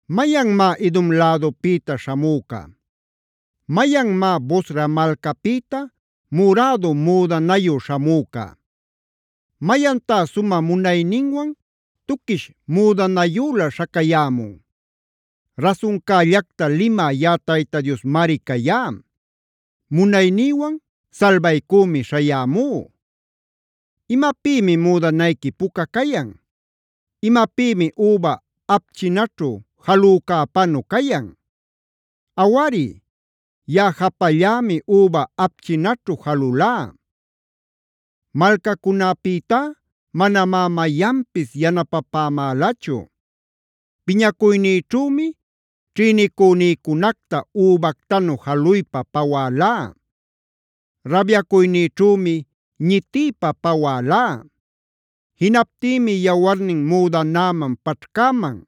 ¿Mayanmá Edom lädupïta śhamüca? ¿Mayanmá Bosra malcapïta murädu müdanayu śhamüca?a ¿Mayantá sumä munayninwan tuquish müdanayülä śhacayämun? “Rasuncällacta limä yaꞌa Tayta Diosmari cayá; munaynïwan salbaycümi śhayämú”. ¿Imapïmi müdanayqui puca cayan? ¿Imapïmi üba apchinaćhu jalücäpanu cayan? “Awari, yaꞌa japallämi üba apchinaćhu jalulá.b Malcacunäpïtá manamá mayanpis yanapapämälachu. Piñacuynïćhümi ćhïnicünïcunacta übactanu jaluypa pawälá; rabyacuynïćhümi ñitiypa pawälá. Jinaptïmi yawarnin müdanäman paćhcäman;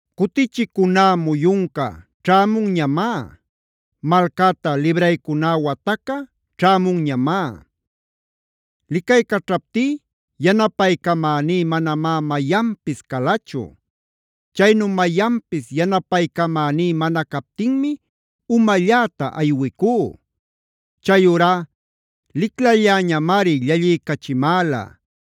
Cutichicuná muyunca ćhämunñamá. Malcäta libraycuná wataca ćhämunñamá. Licaycaćhaptí yanapaycamäní manamá mayanpis calachu. Chaynu mayanpis yanapaycamaní mana captinmi umalläta aywicú. Chayurá liclalläñamari llalliycachimäla;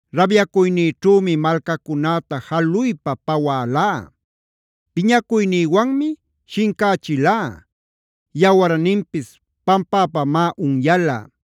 Rabyacuynïćhümi malcacunäta jaluypa pawälá. Piñacuynïwanmi shincächilá; yawarninpis pampäpamá unyala”.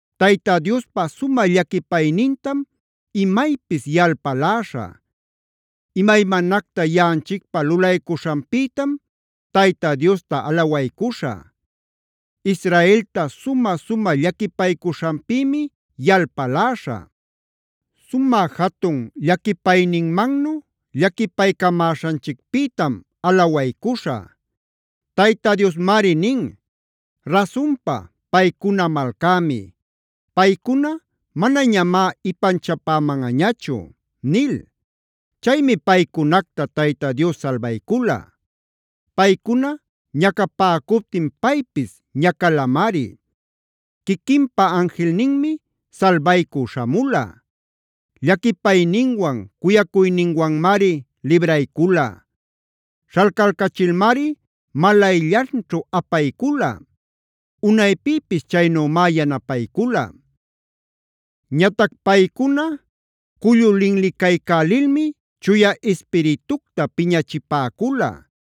Tayta Diospa sumä llaquipaynintam imaypis yalpaläśhä. Imaymanacta yaꞌanchicpä lulaycuśhanpïtam Tayta Diosta alawaycuśhä. Israelta sumä-sumä llaquipaycuśhanpïmi yalpaläśhä. Sumä jatun llaquipayninmannu llaquipaycamäśhanchicpïtam alawaycuśhä. Tayta Diosmari nin: “Rasunpa, paycuna malcämi. Paycuna manañamá ipanchapämanꞌañachu” nil. Chaymi paycunacta Tayta Dios salbaycula. Paycuna ñacapäcuptin paypis ñacalamari; quiquinpa anjilninmi salbaycü śhamula.e Llaquipayninwan cuyacuyninwanmari libraycula. Śhalcalcachilmari malayllanćhu apaycula; unaypïpis chaynümá yanapaycula. Ñatac paycuna cullu linli-caycälilmi Chuya Ispiritucta piñachipäcula.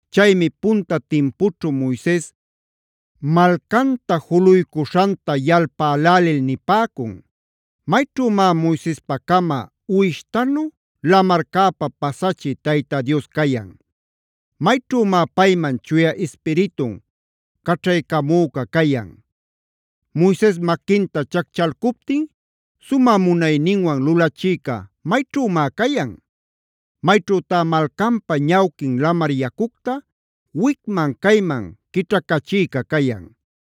Chaymi punta timpućhu Moises malcanta juluycuśhanta yalpälälil nipäcun: “¿Mayćhümá Moisespacama uwishtanu lamarcäpa pasachï Tayta Dios cayan? ¿Mayćhümá payman Chuya Ispiritun caćhaycamüca cayan? Moises maquinta chacchalcuptin ¿sumä munayninwan lulachïca mayćhümá cayan? ¿Mayćhütá malcanpa ñawquin lamar yacucta wicma-cayman quićhacachïca cayan?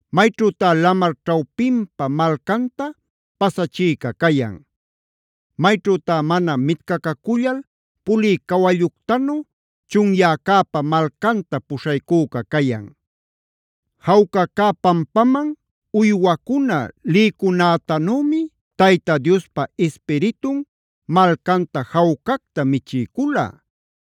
¿Mayćhütá lamar ćhawpinpa malcanta pasachïca cayan? ¿Mayćhütá mana mitcacacullal pulï cawalluctanu chunyäcäpa malcanta puśhaycüca cayan? Jawca cä pampaman uywacuna lïcunätanümi Tayta Diospa Ispiritun malcanta jawcacta michiycula.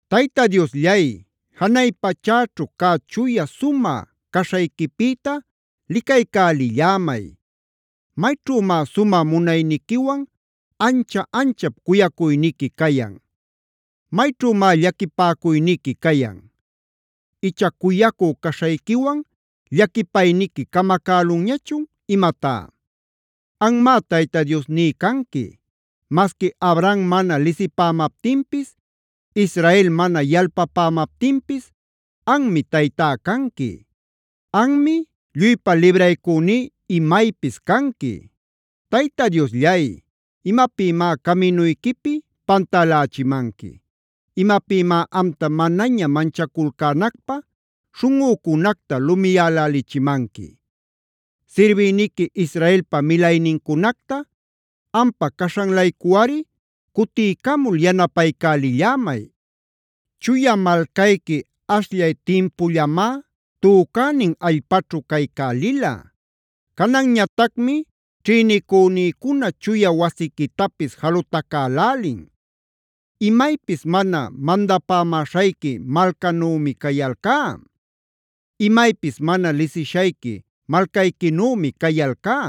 Tayta Diosllay, janay pachäćhu cä chuya sumä caśhayquipïta licaycälillämay. ¿Mayćhümá sumä munayniquiwan ancha-anchap cuyacuyniqui cayan? ¿Mayćhümá llaquipäcuyniqui cayan? Icha ¿cuyacü caśhayquiwan llaquipayniqui camacälunñachun imatá? Anmá Tayta Diosní canqui. Masqui Abraham mana lisipämaptinpis, Israel mana yalpapämaptinpis anmi Taytá canqui. Anmi lluypa libraycüní imaypis canqui. Tayta Diosllay, ¿imapïmá caminuyquipi pantälächimanqui? ¿Imapïmá amta manaña manchaculcänacpä śhunꞌücunacta lumiyälälichimanqui? Sirbïniqui Israelpa milaynincunacta ampa caśhan-laycuꞌari cutiycamul yanapaycälillämay. Chuya malcayqui ashllay timpullamá tücänin allpaćhu caycälila. Cananñatacmi ćhïnicünïcuna chuya wasiquitapis jalutacälälin. Imaypis mana mandapämäśhayqui malcanümi cayalcá. Imaypis mana lisishayqui malcayquinümi cayalcá.